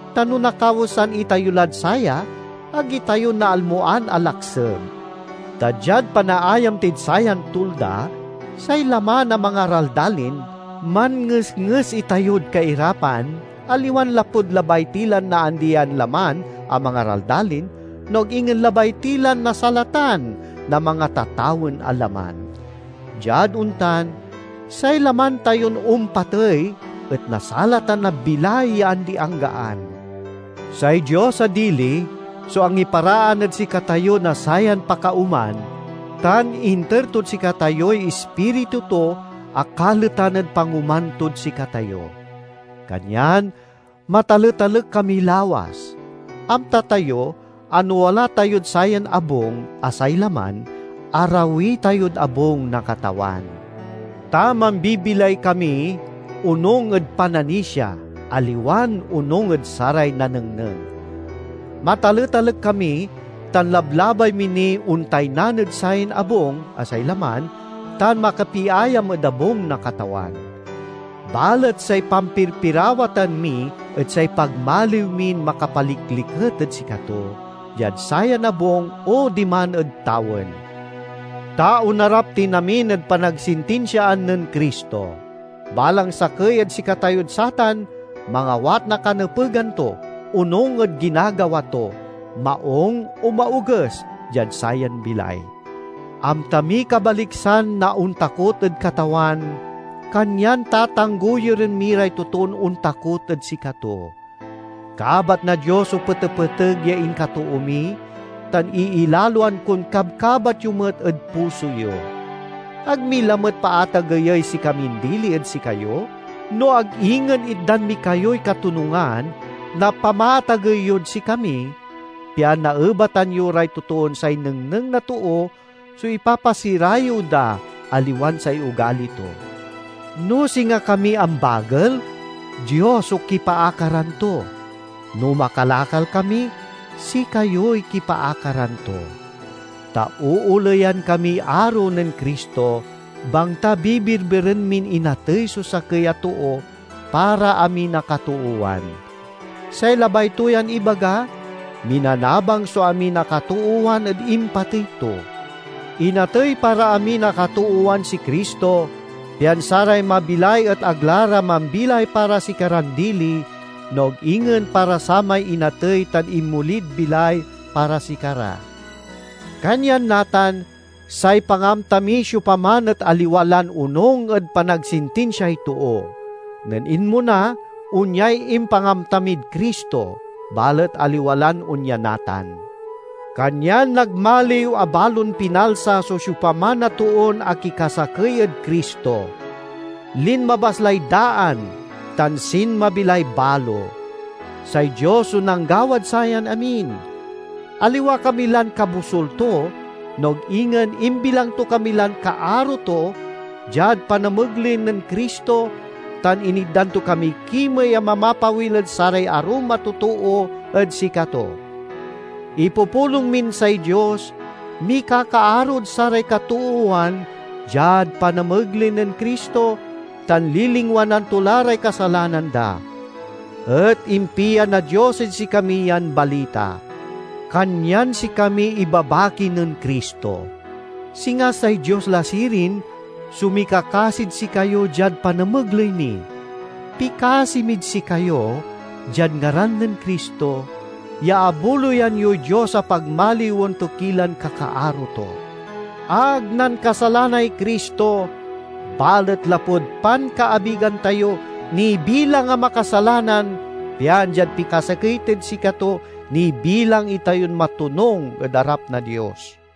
Ta no nakawesan itayo lad saya, ag itayo naalmoan a lakseb. Ta diad panaayam tid sayan tulda, say laman a mangaraldalin, manngesnges itayod kairapan aliwan lapud labay ti lan naandi yan laman a mangaraldalin, no ag ingen labay ti lan nasalatan na mangatatawen a laman. Diad ontan, say laman tayon ompatey et nasalatan na bilay ya andi-anggaan. Say Dios a dili so angiparaan ed sikatayo na sayan pakaoman, tan inter tod sikatayoy Ispiritu to a kaletan ed pangoman tod sikatayo. Kanyan mataletalek kami lawas. Amta tayo a no wala tayod sayan abung, a say laman, arawi tayod abung na Katawan. Ta mambibilay kami onung ed pananisia, aliwan onung ed saray nanengneng. Mataletalek kami tan lablabay mi niy ontaynan ed sayan abung, a say laman, tan makapiayam ed abung na Katawan. Balet say pampirpirawatan mi et say pagmaliw min makapalikliket ed sikato, diad sayan abung o diman ed tawen. Ta onarap tin amin ed panagsintinsiaan nen Cristo. Balang sakey ed sikatayod satan mangawat na kanepegan to, onung ed ginagawa to, maung o maoges, diad sayan bilay. Amta miy kabaliksan na ontakot ed Katawan, kanyan tatanggoyuren mi ray totoon ontakot ed sikato. Kabat na Dios so petepeteg ya inkatoo mi, tan iilaloan kon kabkabat yo met ed puso yo. Ag mi lamet paatageyey sikamin dili ed sikayo, no ag ingen itdan mi kayoy katonungan na pamaatagey yod sikami, pian naebatan yo ray totoon say nengneng na too so ipapasirayew da, aliwan say ogali to. No singa kami ambagel, Dios so kipaakaran to, no makalakal kami, sikayoy kipaakaran to. Ta ooleyan kamiy aro nen Cristo, bangta bibirbiren min inatey so sakey a too para amin a katoowan; say labay to yan ibaga, minanabang so amin a katoowan ed impatey to. Inatey para amin a katoowan si Cristo, pian saray mabilay et ag la ra mambilay para sikaran dili, no ag ingen para samay inatey tan inmolid bilay para sikara. Kanyan natan, say pangamta miy siopaman et aliwa lan onung ed panagsintinsiay too. Nen inmona, onyay impangamta mid Cristo, balet aliwa lan onya natan. Kanyan nagmaliw a balon pinalsa so siopaman a toon akikasakey ed Cristo. Linmabas lay daan, tan sinmabi lay balo. Say Dios so nanggawad sayan amin. Aliwa kami lan kabosul to, no ag ingen imbilang to kami lan kaaro to diad panamegley nen Cristo, tan initdan to kamiy kimey a mamapawil ed saray arum a totoo ed sikato. Ipupulong min say Dios mikakaarod saray katoowan diad panamegley nen Cristo, tan lilingwanan to la ray kasalanan da. Et impia na Dios ed sikami yan balita. Kanyan sikamiy ibabaki nen Cristo. Singa say Dios la sirin so mikakasid sikayo diad panamegley mi; pikasi mid sikayo, diad ngaran nen Cristo, ya abuloyan yoy Dios a pagmaliwen to ki lan kakaaro to! Ag nankasalanay Cristo, balet lapud pankaabigan tayo, nibilang a makasalanan pian diad pikasakey tid sikato, nibilang itayon matonung ed arap na Dios.